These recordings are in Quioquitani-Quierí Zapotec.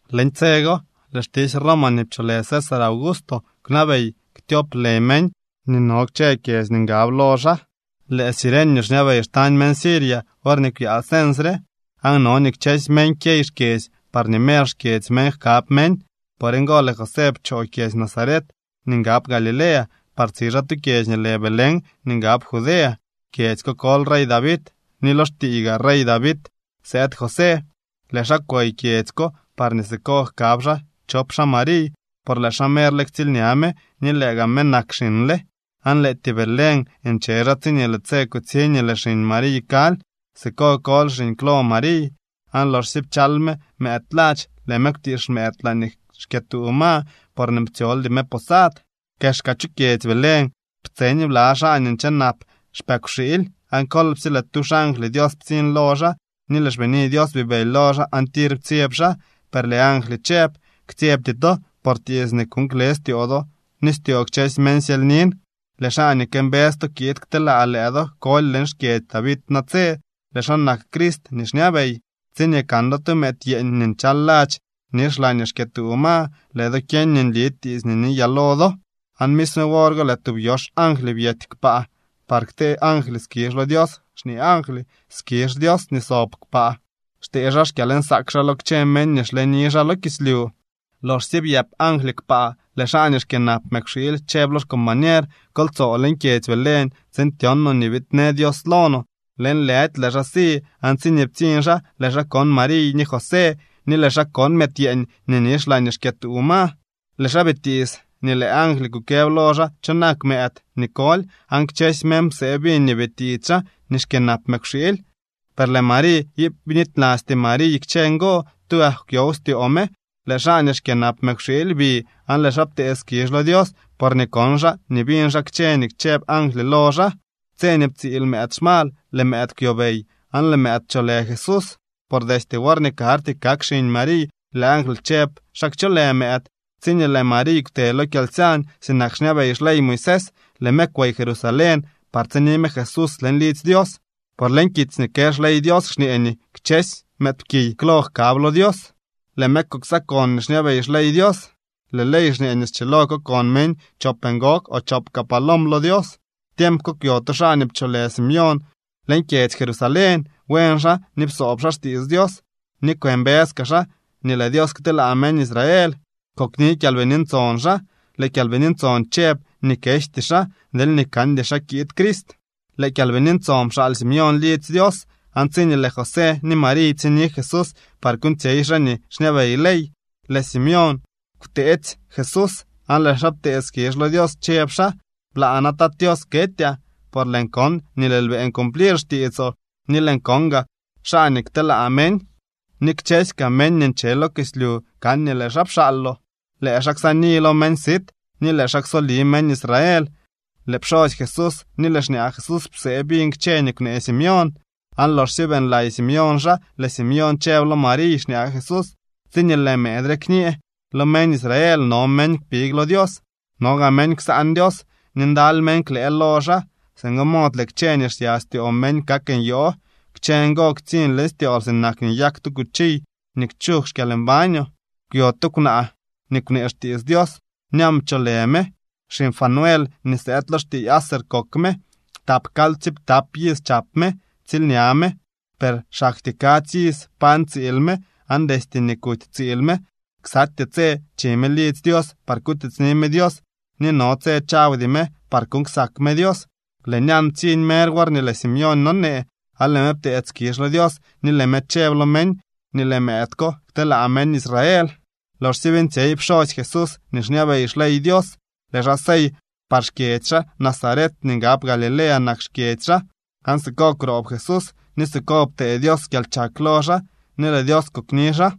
Leñ tse go lëë xtisy Roma nii pcholë César Augusto kwnabey ktyop lë meñ nii no kchë kyedzy nii ngab lo xaa. Lëë Cirenio xñabey xtañ meñ Siria worñee kwyaa cens re. Aan no nii kchësy meñ kyey xkyedzy parñee mer xkyedzy meñ jkab meñ. Por ngo lëë José pchoo kyedzy Nazaret nii ngab Galilea par tsi xaa tu kyedzy nii lë Belén nii ngab Judea. Kyedzy ko koly rey David ni lo xtiiy gaa rey David sëëd José. Lëë xaa kwey kyedzy ko parñee siko jkab xaa chop xaa Mariy, por lëë xaa merle ktsiilña me ni lëë gaa me nak xiñle. Aan lëëtyee Belén nche xaa tsiñee lëë tse kutsiñ nii lëë xiñ Mariy kaly. Siko koly xiñ klo Mariy, aan loxsye pchal me mëëd ladx, lëë me kwtiix mëëd laañee xkyëtuu ma, porñee ptsyoldy me posad. Kexka chu kyedzy Belén ptseñ bla xaa nii nche nap xpëkwxiily. Aan kolpsye lëë tu xangly Dios ptsiñ lo xaa ni lëë xbini Dios bibëly lo xaa aan tir ptsyeb xaa. Per lëë angly chëb: —Ktsyebty to, por tiits nii kuuñ kle styoo do ni styoo kchësy meñ syelynin. Lëë xaa nii këmbës to kiid kteelaa lëë do koly leñ xkyedzy David natse. Lëë xaa nak Crist nii xñabey. Tsiñee kan do tu mëëd yeeñ nii nchal ladx nix laañee xkyëtuu ma, lëë do kyeñ nii nli tiits nii niyaa lo do. Aan misme wor go lëë tub yox angly byety kpaa par ktee angly skizh lo Dios xñee angly: ¡Skizh Dios nii sob kpaa! ¡Xtee xaa xkyalnsaak xaa lo kchë meñ nii xleni xaa lo kislyu! Loxsye byëp angly kpaa, lëë xaa nii xkyënap mëkwxiily chëb lo xcombañer: —Kol tsoo leñ kyedzy Belén tsiin tyon noo nii biidnë Dios lo no. Lëënlëdy lëë xaa si aan tsiñee ptsiñ xaa, lëë xaa kon Mariy ni José ni lëë xaa kon mëëd yeeñ nii nix laañee xkyëtuu ma. Lëë xaa bitiits nii lëë angly kukëb lo xaa cho nak mëëd nii koly. Aan kchësy meñ psee biñ nii bitiits xaa nii xkyënap mëkwxiily. Per lëë Mariy iip bnitylasty Mariy kchë ngo, tugak kwyow styoo me. Lëë xaa nii xkyënap mëkwxiily bi aan lëë xaa ptee skizh lo Dios porñee kon xaa ni biñ xaa kchë nii chëb angly lo xaa. Tse nii ptsiil mëëd xmal, lëë mëëd kwyobey, aan lëë mëëd pcholë Jesús, por destye worñee karty kak xiñ Mariy, lëë angly chëb xa kcholë mëëd. Tsiñee lëë Mariy kwte lo kyalsyañ sinak xñabey xley Moisés, lëë me kwey Jerusalén par tsini me Jesús leñ lidzy Dios. Por leñ kitsy nii kë xley Dios xñee nii kchësy mëëdpkiy klo jkab lo Dios. Lëë me kuksakon nii xñabey xley Dios. Lëë ley xñee nii schilo kokon meñ chop ngog o chop kaa palom lo Dios. Tiemp ko kwyo tu xaa nii pcholë Simeón leñ kyedzy Jerusalén. Buen xaa ni psoob xaa xtiits Dios ni kwëmbës kaa xaa nii lëë Dios kteelaa meñ Israel. Kokni Kyalbini Ntson xaa. Lëë Kyalbini Ntson chëb nii kejty xaa deelñee kandy xaa kiid Crist. Lëë Kyalbini Ntson pxaal Simeón lidzy Dios, aan tsiñee lëë José ni Mariy ptsiñni Jesús par kuuñtsyey xaa nii xñabey ley, lëë Simeón kwteetsy Jesús aan lëë xaa ptee skizh lo Dios chëb xaa: Blaa na, Tat Tios, ketyaa, por lëën kon nii lëël beeñ cumplir xtiitsoo, ni lëën kon gaa xaa nii kteelaa meñ, ni kchësy kaa meñ nii nche lo kislyu kan nii lëë xaa pxaaloo. Lëë xaa ksaani lo meñ sit, ni lëë xaa ksoli meñ Israel. Lëë pxosy Jesús ni lëë xñaa Jesús psee biñ kchë nii kwnee Simeón. Aan loxsye beeñlay Simeón xaa, lëë Simeón chëb lo Mariy, xñaa Jesús: —Tsiñee lëë mëëd re kñee lo meñ Israel no meñ kpig lo Dios, no gaa meñ ksaan Dios, ni ndaly meñ klëë lo xaa. Singo mod lëë kchë nii xsya styoo meñ kak nyoo. Kchë ngo ktsiñ leñ styool sinak nii nyak tu cuchiy nii kchug xkyalmbañoo. Kwyo tu kwnaa nii kwnee xtiits Dios. Ñan pcholë me. Xiñ Fanuel nii sëëd lo xtiiy Aser kok me. Tap kaly ptsiiptap iz chap me. Ptsiilña me, per xaktyee kadzy iz pañ tsiil me, aan destye nii kuty tsiil me, ksatyee tse chi me lidzy Dios par kutiitsni me Dios ni no tse chawdy me par kuuñ ksak me Dios. Lëë Ñan ptsiñ mer worñee lëë Simeón nonee aan lëë me pteedy skizh lo Dios ni lëë me chëb lo meñ nii lëë mëëd ko kteelaa meñ Israel. Loxsye beeñtsyey pxosy Jesús nii xñabey xley Dios, lëë xaa sey par xkyedzy xaa. Nazaret nii ngab Galilea nak xkyedzy xaa. Aan siko kwroob Jesús ni siko ptee Dios kyalchak lo xaa ni lëë Dios kokni xaa.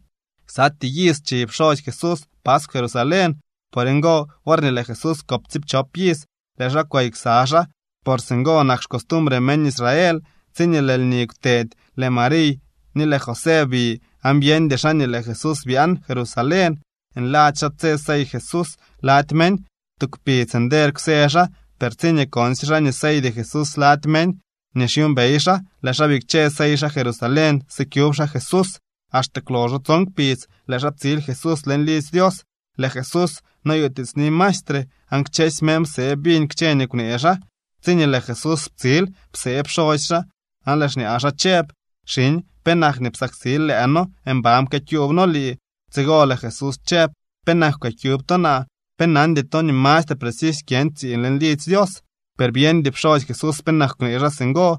Ksatyee iz chi pxosy Jesús paskw Jerusalén. Por ngo, worñee lëë Jesús kop tsiipchop iz, lëë xaa kwey ksa xaa, por singo nak xcostumbre meñ Israel. Tsiñee lëë lni kwtedy, lëë Mariy ni lëë José bi aan byeñdy xaa nii lëë Jesús byaan Jerusalén. Nladzy xaa tse sey Jesús lady meñ. Tu kpidz nder kwsë xaa, per tsiñee konsye xaa nii seydy Jesús lady meñ nii xyuumbey xaa, lëë xaa bikche sey xaa Jerusalén sikyub xaa Jesús. Axte kwloxo tson kpidz, lëë xaa ptsil Jesús leñ lidzy Dios. Lëë Jesús noyutiitsni maestre. Aan kchësy meñ psee biñ kchë nii kwnee xaa. Tsiñee lëë Jesús ptsil, psee pxosy xaa, aan lëë xñaa xaa chëb: —Xiñ, ¿penak nii psaksil lëë noo? Mban pkyëkyuub noo lii. Tsigo lëë Jesús chëb: —¿Penak kwëkyub to naa? ¿Pe nandy to nii mastre precisy kyën tsiiñ leñ lidzy Dios? Per byeñdy pxosy Jesús penak kwnee xaa singo.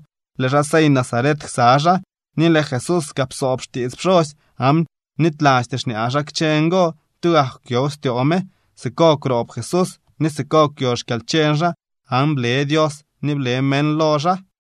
Lëë xaa sey Nazaret ksa xaa, ni lëë Jesús kaa psoob xtiits pxosy, aan bnitylasty xñaa xaa kchë ngo. Tugak kwyow styoo me. Siko kwroob Jesús ni siko kwyo xkyalcheñ xaa aan ble Dios ni ble meñ lo xaa.